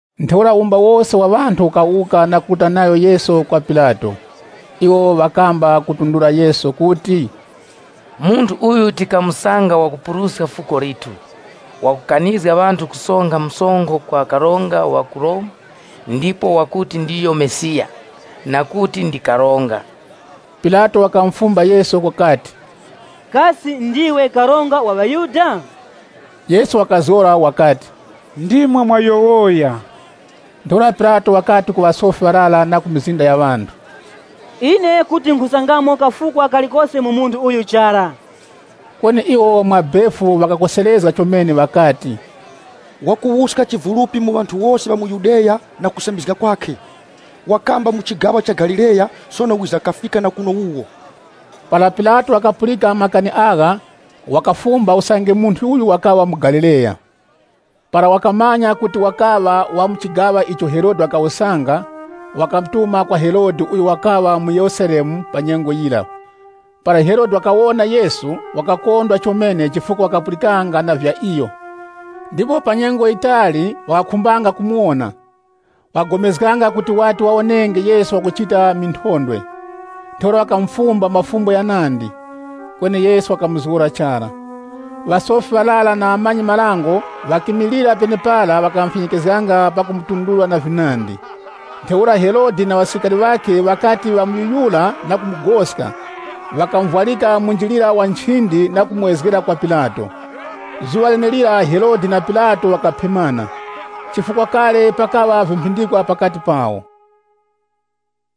Ntheura wumba wose wa ŵanthu ukawuka na kuruta nayo Yesu kwa Pilato. Iwo ŵakamba kutundura Yesu kuti, “Munthu uyu tikamusanga wakupuruska fuko lithu. Wakukanizga ŵanthu kusonkha msonkho kwa karonga wa ku Romu, ndipo wakuti ndiyo Mesiya, na kuti ndi karonga.” Pilato wakamufumba Yesu wakati, “Kasi ndiwe karonga wa ŵaYuda?” Yesu wakazgora wakati, “Ndimwe mwayowoya.” Ntheura Pilato wakati ku ŵasofi ŵarara na mizinda ya ŵanthu, “Ine kuti nkhusangamo kafukwa kalikose mu munthu uyu chara.” Kweni iwo mwa befu ŵakakoserezga chomene ŵakati, “Wakuwuska chivulupi mu ŵanthu wose ŵa mu Yudeya na kusambizga kwakhe. Wakamba mu chigaŵa cha Galileya sono wiza kafika na kuno wuwo.” Para Pilato wakapulika makani agha, wakafumba usange munthu uyu wakaŵa muGalileya? Para wakamanya kuti wakaŵa wa mu chigaŵa icho Herode wakawusanga, wakamutuma kwa Herode uyo wakaŵa mu Yerusalemu pa nyengo yira. Para Herode wakawona Yesu, wakakondwa chomene chifukwa wakapulikanga na vya iyo, ndipo pa nyengo yitali wakakhumbanga kumuwona. Wakagomezganga kuti wati wawonenge Yesu wakuchita minthondwe. Ntheura wakamufumba mafumbo ghanandi, kweni Yesu wakamuzgora chara. Ŵasofi ŵarara na ŵamanyi-marango ŵakimilira penepara ŵakamufyekezganga pakumutundura na vinandi. Ntheura Herode na ŵasilikari ŵakhe, ŵakati ŵamuyuyura na kumugoska, ŵakamuvwarika munjilira wa nchindi na kumuwezgera kwa Pilato. Zuŵa lenelira Herode na Pilato ŵakaphemana, chifukwa kale pakaŵa vimphindikwa pakati pawo.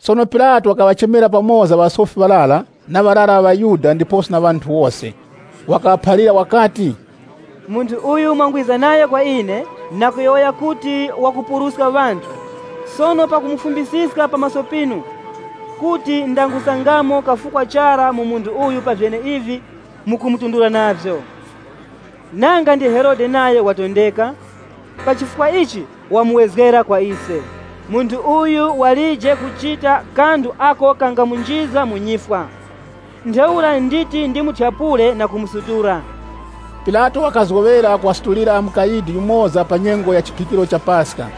Sono Pilato wakaŵachema pamoza ŵasofi ŵarara, na ŵarara ŵa ŵaYuda, ndiposo na ŵanthu wose. Wakaŵaphalira wakati, “Munthu uyu mwangwiza nayo kwa ine, na kuyowoya kuti wakupuruska ŵanthu, sono pakumufumbisiska pa maso pinu, kuti ndangusangamo kafukwa chara mu munthu uyu pa vyeneivi mukumutundura navyo. Nanga ndi Herode nayo watondeka, pa chifukwa ichi wamuwezgera kwa ise. Munthu uyu walije kuchita kanthu ako kangamunjizga mu nyifwa. Ntheura nditi ndimuthyapule na kumusutula.” [ Pilato wakazgoŵera kuŵasutulira mukayidi yumoza pa nyengo ya chiphikiro cha Paska.]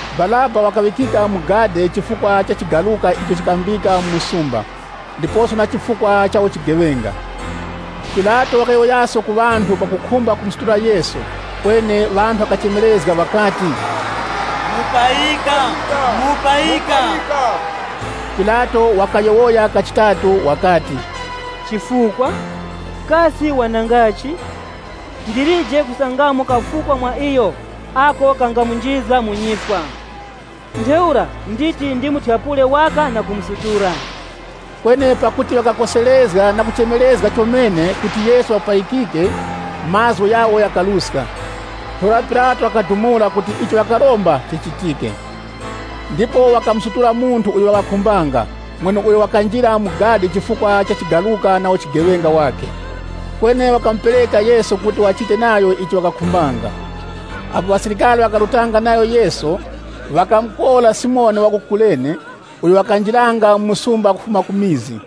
Baraba wakaŵikika mu gadi chifukwa cha chigaruka icho chikambika mu msumba, ndiposo na chifukwa cha uchigeŵenga. Pilato wakayowoyaso na ŵanthu pakukhumba kumusutula Yesu, kweni ŵanthu ŵakachemerezga ŵakati, “Mupayika, Mupayika!” Pilato wakayowoya kachitatu wakati, “Chifukwa? Kasi wanangachi? Ndilije kusangamo kafukwa mwa iyo ako kangamunjizga mu nyifwa. Ntheura nditi ndimuthyapule waka na kumusutula.” Kweni pakuti ŵakakorekanga chara na kuchemerezga chomene kuti Yesu wapayikike, mazgu ghawo ghakaruska. Ntheura Pilato wakadumula kuti icho ŵakaromba chichitike. Ndipo wakamusutula munthu uyo ŵakakhumbanga mweneuyo wakanjira mu gadi chifukwa cha chigaruka na uchigeŵenga wakhe. Kweni wakamupereka Yesu kuti ŵachite nayo icho ŵakakhumbanga. Apo ŵasilikari ŵakarutanga nayo Yesu, ŵakamukora Simoni wa ku Kurene, uyo wakanjiranga mu msumba kufuma ku mizi,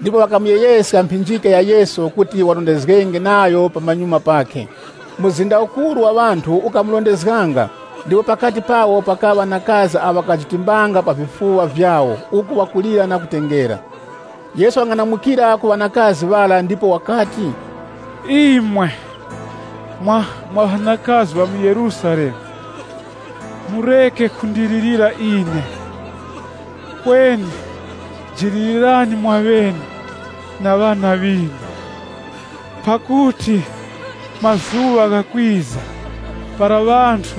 ndipo ŵakamuyegheska mphinjika ya Yesu kuti warondezgenge nayo pamanyuma pakhe. Mzinda ukuru wa ŵanthu ukamurondezganga ndipo pakati pawo pakaŵa ŵanakazi awo ŵakajitimbanga pa vifuŵa vyawo uku ŵakulira na kutengera. Yesu wakang'anamukira ku ŵanakazi ŵara ndipo wakati, “Imwe mwa ŵanakazi ŵa mu Yerusalemu, mureke kundilirira ine, kweni jilirirani mwaŵene na ŵana ŵinu. Pakuti mazuŵa ghakwiza para ŵanthu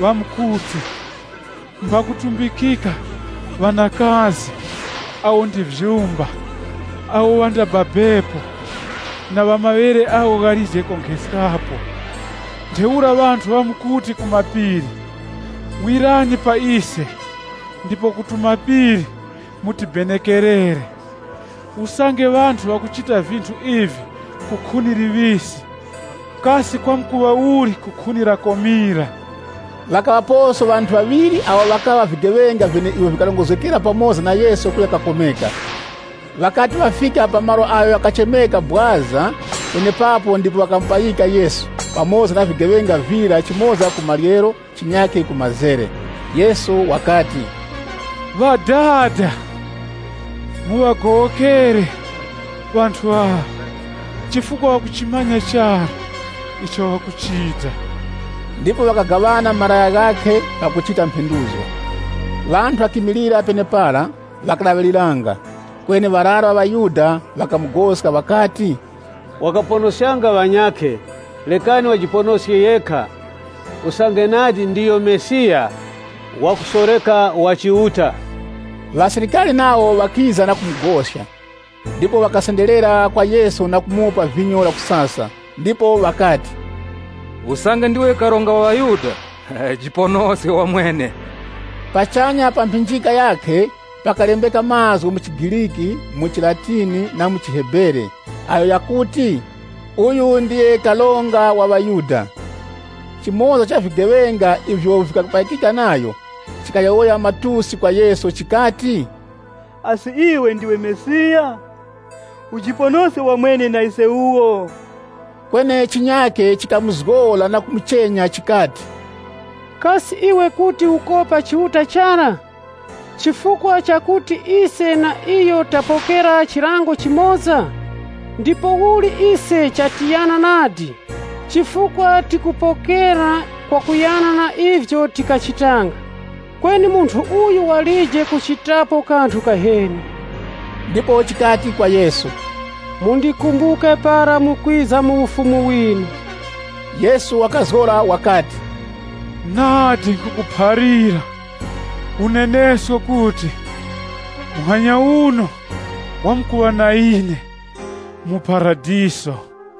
ŵamkuti, ‘Mbakutumbikika awo ndi vyumba, awo ŵandababepo, ndiposo na maŵere agho ghalije konkheskapo!’ Ntheura ŵanthu ŵamkuti ku mapiri, ‘Wirani pa ise,’ ndipo ku tumapiri, ‘Tibenekererani.’ Usange ŵanthu ŵakuchita vinthu ivi ku khuni liŵisi, kasi kwamkuŵa uli ku khuni lakomira?” Ŵakaŵaposo ŵanthu ŵaŵiri awo ŵakaŵa vigeŵenga vyeneivyo vikarongozgekera pamoza na Yesu kuya kakomeka. Ŵakati ŵafika pa malo agho ghakuchemeka “Bwaza”, penepapo ndipo ŵakamupayika Yesu, pamoza na vigeŵenga vira chimoza ku maryero, chinyakhe ku mazere. Yesu wakati, “Ŵadada, muŵagowokere ŵanthu aŵa chifukwa ŵakuchimanya chara icho ŵakuchita.” Ndipo ŵakagaŵana malaya ghakhe pakuchita mphenduzgo. Ŵanthu ŵakimilira penepara, ŵakalaŵiriranga, kweni ŵarara ŵa ŵaYuda ŵakamugoska ŵakati, “Wakaponoskanga ŵanyakhe, rekani wajiponoske yekha, usange nadi ndiyo Mesiya, wakusoreka wa Chiuta.” Ŵasilikari nawo ŵakiza na kumugoska, ndipo ŵakasenderera kwa Yesu na kumupa vinyo lakusasa. Ndipo ŵakati, “Usange ndiwe Karonga wa ŵaYuda, ujiponoske wamwene.” Pachanya pa mphinjika yakhe pakalembeka mazgu mu chiGriki, mu chiLatini na mu chiHebere, agho ghakuti, “Uyu Ndiyo Karonga wa ŵaYuda.” Chimoza cha vigeŵenga ivyo vikapayikika nayo, chikayowoya matusi kwa Yesu chikati, “Asi iwe ndiwe Mesiya? Ujiponoske wamwene na ise wuwo!” Kweni chinyakhe chikamuzgora na kumuchenya chikati, “Kasi iwe kuti ukopa Chiuta chara? Chifukwa chakuti ise na iyo tapokera chilango chimoza? Ndipouli ise chatiyana nadi, chifukwa tikupokera kwakuyana na ivyo tikachitanga. Kweni munthu uyu walije kuchitapo kanthu kaheni.” Ndipo chikati kwa Yesu, “Mundikumbuke para mukwiza mu Ufumu winu.” Yesu wakazgora wakati, “Nadi nkhukuphalira unenesko kuti, muhanya uno wamkuŵa na ine mu Paradiso.”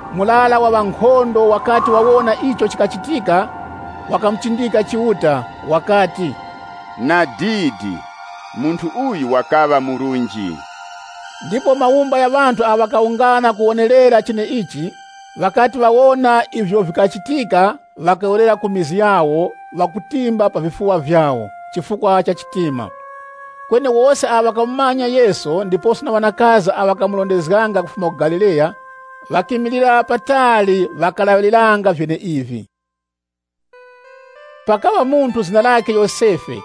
Murara wa ŵankhondo wakati wawona icho chikachitika wakamuchindika Chiuta, wakati, “Nadidi, munthu uyu wakaŵa murunji!” Ndipo mawumba gha ŵanthu awo ŵakawungana kukawonerera cheneichi, ŵakati ŵawona ivyo vikachitika ŵakawerera ku mizi yawo ŵakutimba pa vifuŵa vyawo kurongora chitima. Kweni wose awo ŵakamumanya Yesu, ndiposo na ŵanakazi awo ŵakamurondezga kufuma ku Galileya, ŵakimilira patali ŵakalaŵiriranga vyeneivi. Pakaŵa munthu zina lakhe Yosefe,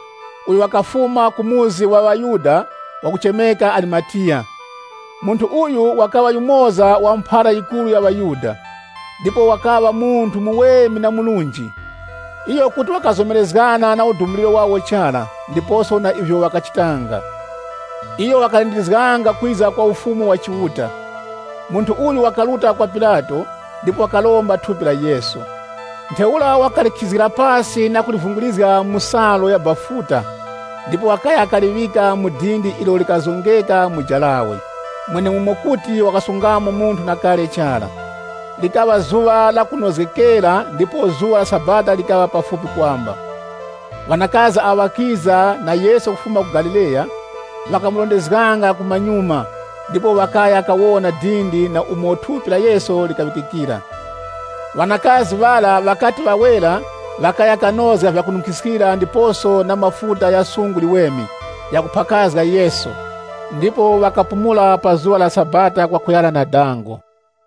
uyo wakafuma ku muzi wa ŵaYuda wakuchemeka Arimatiya. Munthu uyu wakaŵa yumoza wa mphara yikuru ya ŵaYuda ndipo wakaŵa munthu muweme na murunji. Iyo kuti wakazomerezgana na udumuliro wawo chara, ndiposo na ivyo ŵakachitanga. Iyo wakalindizganga kwiza kwa Ufumu wa Chiuta Munthu uyu wakaruta kwa Pilato, ndipo wakaromba thupi la Yesu. Ntheura wakalikhizgira pasi na kulivungirizga mu salu ya bafuta, ndipo wakaya kaliŵika mu dindi ilo likazongeka mu jarawe, mwenemumo kuti ŵakasungamo munthu na kale chara. Likaŵa zuŵa la kunozgekera, ndipo zuŵa la Sabata likaŵa pafupi kwamba. Ŵanakazi awo ŵakiza na Yesu kufuma ku Galileya, ŵakarondezganga mumanyuma ndipo ŵakaya kawona dindi na umo thupi la Yesu likaŵikikira. Ŵanakazi ŵara ŵakati ŵawera ŵakaya kanozga vyakununkhiskira ndiposo na mafuta gha sungu liweme ghakuphakazga Yesu. Ndipo ŵakapumula pa zuŵa la Sabata kwakuyana na dango.